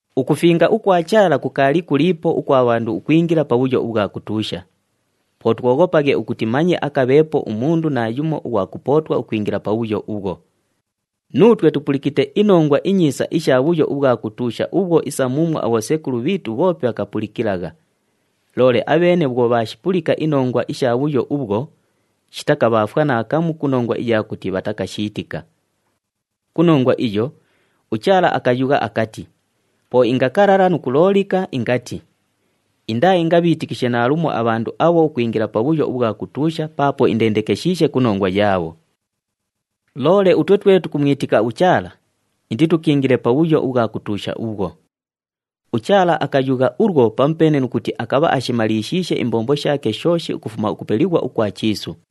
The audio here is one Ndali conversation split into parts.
Ukufinga ukwa Chaala kukaali kuliipo ukwa bhandu ukwingila pabhuyo ubhwa kutuusha. Po twoghopaghe ukuti manye akabheepo umundu naayumo ughwa kupootwa ukwingila pabhuyo ubhwo. Nuutwe tupulikite iNongwa iNyiisa isha bhuyo ubhwa kutuusha ubhwo isa muumwo abhosekulu bhiitu bhoope bhakapulikilagha. Loole abheene bhwo bhaashipulika inongwa isha bhuyo ubhwo, shitakabhaafwa naakamu ku nongwa iya kuti bhatakashiitika. Ku nongwa iyo, uChaala akayugha akati, “Po ingakalala nu kuloolika, ingati, ‘Indaaingabhiitikishe naalumo abhandu abho ukwingila pabhuyo ubhwa kutuusha, paapo indendekeshiishe ku nongwa yaabho.’” Loole utwe twe tukumwitika uChaala, inditukiingile pabhuyo ubhwa kutuusha ubhwo. UChaala akayugha ulwo pamupeene nu kuti akabha ashimalishiishe imbombo shaake shooshi ukufuma ukupelighwa ukwa chiisu.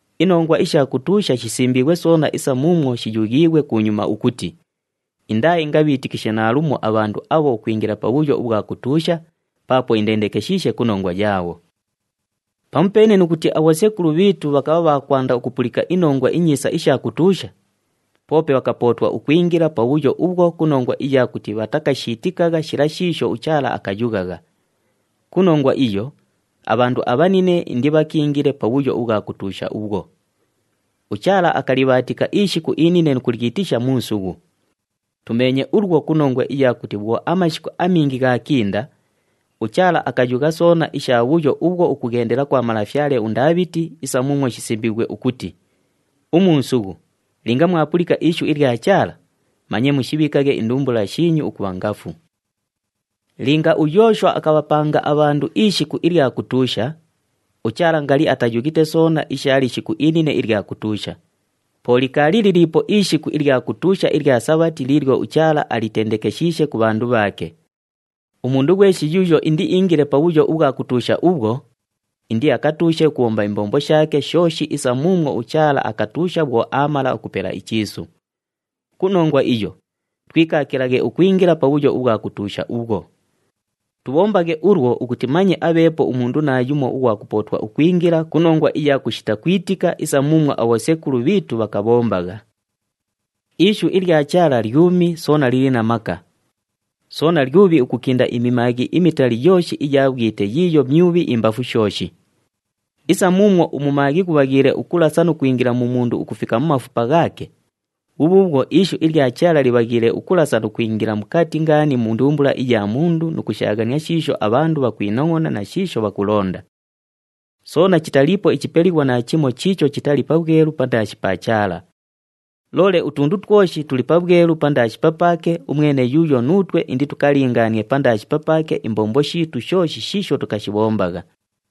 Inongwa isha kutuusha shisimbiighwe soona isa muumwo shiyughiighwe kunyuma ukuti, “Indaaingabhiitikishe naalumo abhandu abho ukwingila pabhuyo ubhwa kutuusha paapo indendekeshiishe ku nongwa yaabho.” Pamupeene nu kuti abhosekulu bhiitu bhakabha bha kwanda ukupulika iNongwa iNyiisa isha kutuusha, poope bhakapootwa ukwingila pabhuyo ubhwo ku nongwa iya kuti bhatakashiitikagha shila shiisho uChaala akayughagha. Ku nongwa iyo, abhandu abhanine indibhakiingile pabhuyo ubhwa kutuusha ubhwo. UChaala akalibhaatika ishiku inine nu kulyitisha, “Muusughu.” Tumeenye ulwo ku nongwa iya kuti bhwo amashiku amingi ghaakinda, uChaala akayugha soona isha bhuyo ubhwo ukughendela kwa malafyale uNdaabhiti isa muumwo shisimbiighwe ukuti, “Umuusughu, linga mwapulika ishu ilya Chaala, manye mushibhiikaghe indumbula shiinyu ukubha ngafu.” Linga uYooshwa akabhapanga abhandu ishiku ilya kutuusha, uChaala ngali atayughite soona isha lishiku inine ilya kutuusha. Po likaali liliipo ishiku ilya kutuusha ilya Sabhati liilyo uChaala alitendekeshiishe ku bhandu bhaake. Umundu ghweshi yuuyo indiiingile pabhuyo ubhwa kutuusha ubhwo, indiakatuushe ukubhomba imbombo shaake shooshi isa muumwo uChaala akatuusha bhwo aamala ukupela ichiisu. Ku nongwa iyo, twikaakilaghe ukwingila pabhuyo ubhwa kutuusha ubhwo. Tubhombaghe ulwo ukuti manye abheepo umundu naayumo ughwa kupootwa ukwingila ku nongwa iya kushita kwitika isa muumwo abhosekulu bhiitu bhakabhombagha. Ishu ilya Chaala lyumi soona lili na maka. Soona lyubhi ukukinda imimaaghi imitali yooshi iya bhwite yiiyo myubhi imbafu shooshi. Isa muumwo umumaaghi ghubhaghiile ukulasa nu kwingila mu mundu ukufika mu mafupa ghaake, bhubhuubhwo ishu iya Chaala libhaghiile ukulasa nu kwingila mukati ngaani mu ndumbula iya mundu nu kushaaghania shiisho abhandu bhakwinongʼona na shiisho bhakulonda. Soona chitaliipo ichipelighwa naachimo chiicho chitali pabhwelu pandaashi pa Chaala. Loole utundu twoshi tuli pabhwelu pandaashi papaake umwene yuuyo nuutwe inditukalingaanie pandaashi papaake imbombo shiitu shooshi shiisho tukashibhombagha.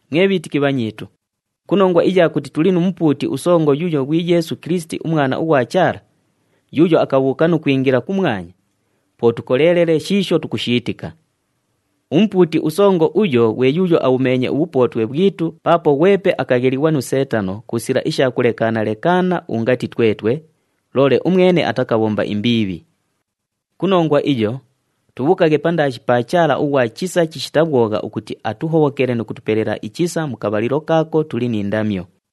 Mwe bhiitiki bhanyiitu, ku nongwa iya kuti tuli nu Mupuuti uSongo yuuyo ghwi Yeesu Kilisiti uMwana ughwa Chaala, yuuyo akabhuuka nu kwingila kumwanya, po tukoleelele shiisho tukushiitika. UMupuuti uSongo uyo ghwe yuuyo abhumeenye ubhupootwe bhwitu paapo ghwepe akaghelighwa nu Seetano ku sila isha kulekaana-lekaana ungati twetwe, loole umwene atakabhomba imbiibhi. Ku nongwa iyo, tubhuukaghe pandaashi pa Chaala ughwa chisa chishita bhwogha ukuti atuhobhokele nu kutupelela ichisa mu kabhalilo kaako tuli ni ndamyo.